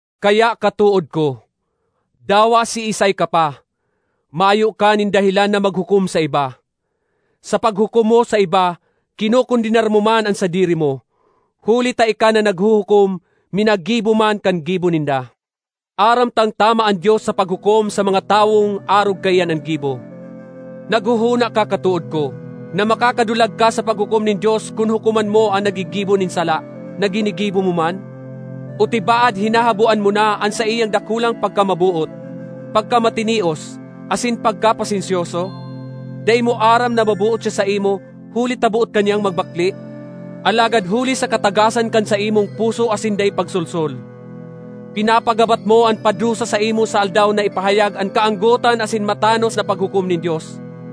Kaya, katood ko, dawa siisay ka pa, mayo ka nin dahelan na maghukom sa iba. Sa paghukom mo sa iba, kinokondenar mo man an sadiri mo, huli ta ika na naghuhukom minagibo man kan gibo ninda. Aram tang tama an Dios sa paghukom sa mga tawong arog kaiyan an gibo. Naghohona ka katood ko, na makakadulag ka sa paghukom nin Dios kun hukoman mo an naggigibo nin sala, na ginigibo mo man? O tibaad hinahaboan mo an saiyang dakulang pagkamaboot, pagkamatinios asin pagkapasensyoso? Dai mo aram na maboot siya saimo huli ta boot ka niyang magbakle? Alagad huli sa katagasan kan saimong puso asin dai pagsolsol, pinapagabat mo an padusa saimo sa Aldaw na ipahayag an kaanggotan asin an matanos na paghukom nin Dios.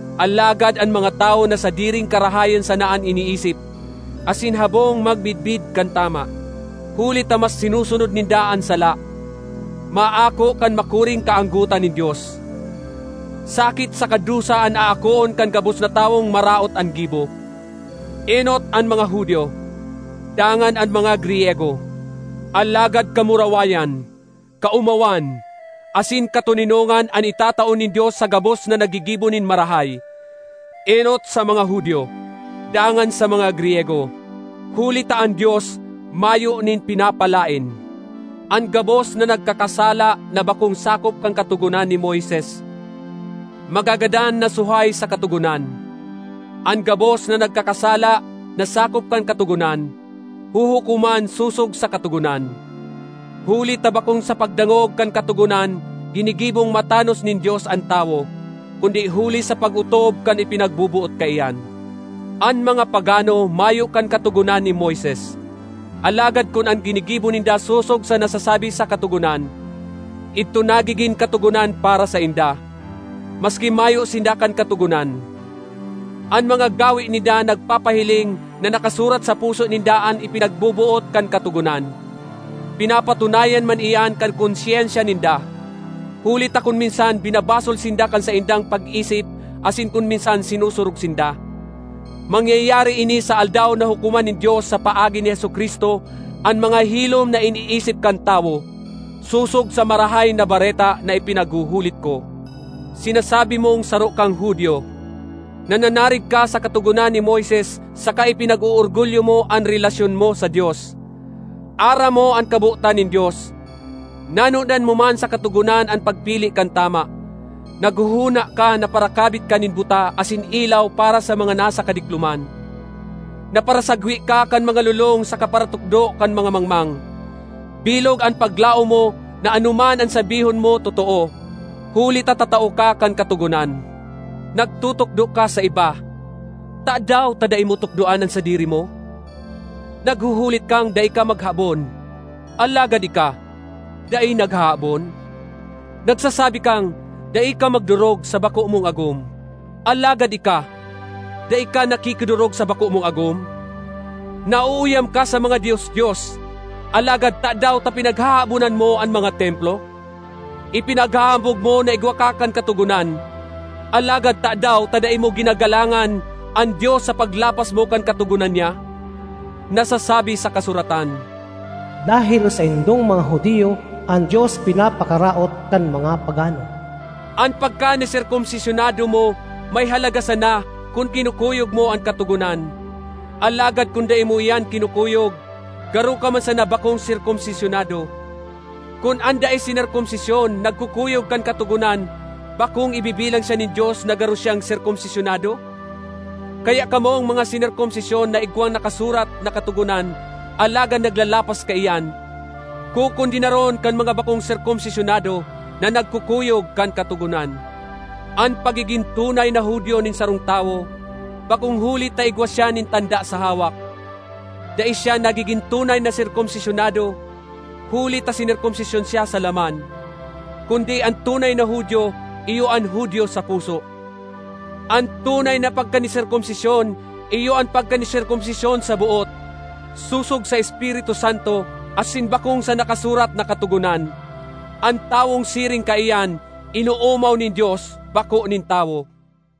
Alagad an mga tawo na sadiring karahayan sana an iniisip asin habong magmidbid kan tama, huli ta mas sinusunod ninda an sala, maako kan makuring kaanggotan nin Dios. Sakit saka dusa an aakoon kan gabos na tawong maraot an gibo, enot an mga Judio, dangan an mga Griyego. Alagad kamurawayan, kaomawan, asin katoninongan an itatao nin Dios sa gabos na naggigibo nin marahay, enot sa mga Judio, dangan sa mga Griyego. Huli ta an Dios mayo nin pinapalaen. An gabos na nagkakasala na bakong sakop kan Katogonan ni Moises, magagadan na suhay sa Katogonan. An gabos na nagkakasala na sakop kan Katogonan, huhukoman sosog sa Katogonan. Huli ta bakong sa pagdangog kan Katogonan ginigibong matanos nin Dios an tawo, kundi huli sa pag-otob kan ipinagboboot kaiyan. An mga pagano mayo kan Katogonan ni Moises, alagad kun an ginigibo ninda sosog sa nasasabi sa Katogonan, idto nagigin katogonan para sainda, maski mayo sinda kan Katogonan. An mga gawe ninda nagpapahiling na nakasurat sa puso ninda an ipinagboboot kan Katogonan. Pinapatunayan man iyan kan konsyensya ninda, huli ta kun minsan binabasol sinda kan saindang pag-isip asin kun minsan sinusurog sinda. Mangyayari ini sa Aldaw na hukoman nin Dios sa paagi ni Jesu-Cristo an mga hilom na iniisip kan tawo, sosog sa Marahay na Bareta na ipinaghuhulit ko. Sinasabi mong saro kang Judio, nananarig ka sa Katogonan ni Moises saka ipinag-oorgulyo mo an relasyon mo sa Dios. Aram mo an kabotan nin Dios; nanodan mo man sa Katogonan an pagpili kan tama. Naghohona ka na parakabit ka nin buta asin ilaw para sa mga nasa kadikloman; na parasagwe ka kan mga lolong saka paratukdo kan mga mangmang. Bilog an paglaom mo na anoman an sabihon mo totoo, huli ta tatao ka kan Katogonan. Nagtutukdo ka sa iba, tadaw ta dai mo tukdoan an sadiri mo? Naghuhulit kang, “Dai ka maghabon” alagad ika, dai naghahabon? Nagsasabi kang, “Dai ka magdorog sa bako mong agom” alagad ika, dai ka nakikidorog sa bako mong agom? Nauuyam ka sa mga dios-dios, alagad tadaw ta pinaghahabonan mo an mga templo? Ipinaghahambog mo na igwa ka kan katogonan, alagad tadaw ta dai mo ginagalangan an Dios sa paglapas mo kan katogonan niya? Nasasabi sa kasuratan, “Dahel saindong mga Judio, an Dios pinapakaraot kan mga pagano.” An pagkaniserkomsisyonado mo may halaga sana kun kinukuyog mo an Katogonan, alagad kun dai mo iyan kinukuyog, garo ka man sana bakong serkomsisyonado. Kun an dai sinerkomsisyon nagkukuyog kan Katogonan, bakong ibibilang siya nin Dios na garo siyang serkomsisyonado? Kaya kamong mga sinerkomsisyon na igwang nakasurat na Katogonan alagad naglalapas kaiyan, kokondenaron kan mga bakong serkomsisyonado na nagkukuyog kan Katogonan. An pagigin tunay na Judio nin sarong tawo bakong huli ta igwa siya nin tanda sa hawak; dai siya nagigin tunay na serkomsisyonado huli ta sinerkomsisyon siya sa laman. Kundi, an tunay na Judio iyo an Judio sa puso; an tunay na pagkaniserkomsisyon iyo an pagkaniserkomsisyon sa boot, sosog sa Espiritu Santo asin bakong sa nakasurat na Katogonan. An tawong siring kaiyan inoomaw nin Dios, bako nin tawo.